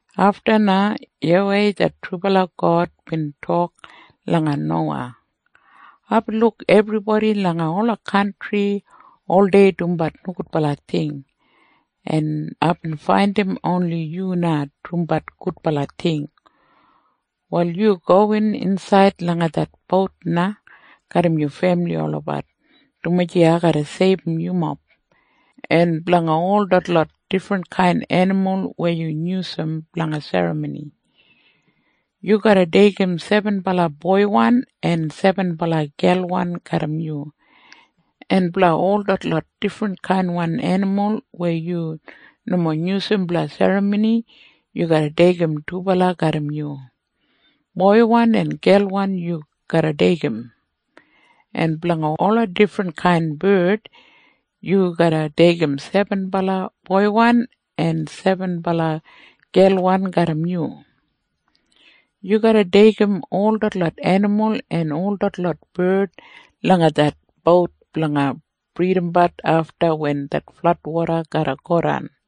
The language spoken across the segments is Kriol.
Afta na YAWEI det trubala God bin tok langa Nowa, “Aibin luk ebribodi langa ola kantri oldei dumbat nogudbala ting, en aibin faindim oni yu na dumbat gudbala ting. Wal yu gowin insaid langa det bout na garram yu femili olabat, dumaji ai garra seibum yumob. En blanga ol detlot difrinkain enimul weya yu yusum langa serramoni, yu garra deigim sebenbala boiwan en sebenbala gelwan garram yu. En blanga ol detlot difrinkain enimul weya yu nomo yusum langa serramoni, yu garra deigim dubala garram yu. Boiwan en gelwan yu garra deigim. En blanga ola difrinkain bard, yu garra deigim sebenbala boiwan en sebenbala gelwan garram yu. Yu garra deigim ol detlot enimul en ol detlot bard langa det bout blanga bridabat afta wen det fladwoda garra godan.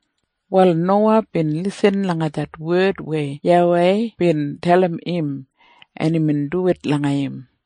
Wal Nowa bin lisin langa det wed weya YAWEI bin dalim im, en imbin duwit langa im.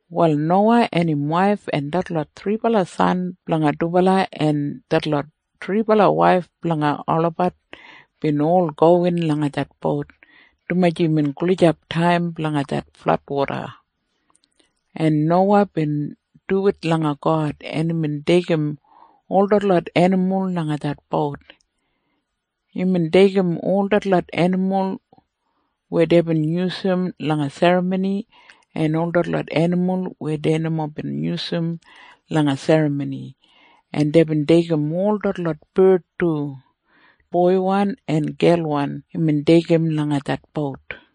Wal Nowa en im waif en detlot thribala san blanga dubala en detlot thribala waif blanga olabat bin ol gowin langa det bout, dumaji imbin gulijap taim blanga det fladwoda, en Nowa bin duwit langa God, en imbin deigim ol detlot enimul langa det bout. Imbin deigim ol detlot enimul weya deibin yusum langa serramoni en ol detlot enimul weya dei nomo bin yusum langa serramoni, en imbin deigim ol detlot bard du. Boiwan en gelwan imbin deigim langa det bout.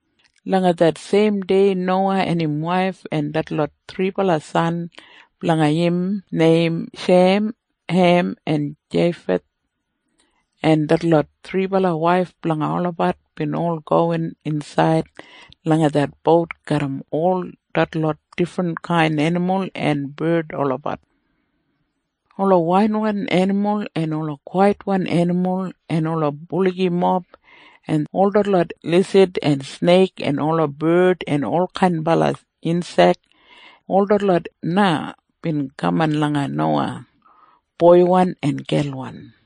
Langa det seim dei Nowa en im waif en detlot thribala san blanga im neim Shem, Hem en Jeifeth en detlot thribala waif blanga olabat bin ol gowin insaid langa det bout garram ol detlot difrinkain enimul en bard olabat. Ola wailwan enimul en ola kwaitwan enimul en ola buligimob en ol detlot lisid en sneik en ola bard en olkain insek, ol detlot na bin kaman langa Nowa, boiwan en gelwan,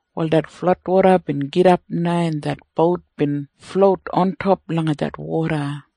Wal det fladwoda bin gidap na, en det bout bin flout ontop langa det woda,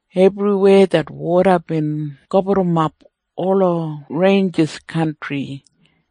Ebriweya det woda bin gaburrumap ola reinjis kantri.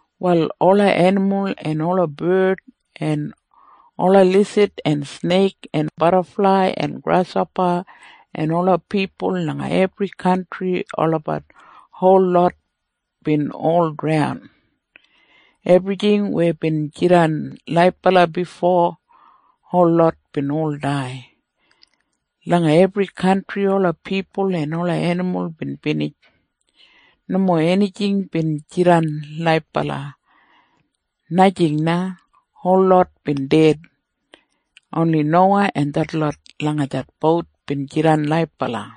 Wal ola enimul en ola bard en ola lisid en sneik en badaflai en grashopa en ola pipul langa ebri kantri olabat holot bin ol draun. Ebrijing weya bin jidan laibala bifo holot bin ol dai. Langa ebri kantri ola pipul en ola enimul bin binij. Nomo enijing bin jidan laibala. Najing na. Holot bin ded. Oni Nowa en detlot langa det bout bin jidan laibala.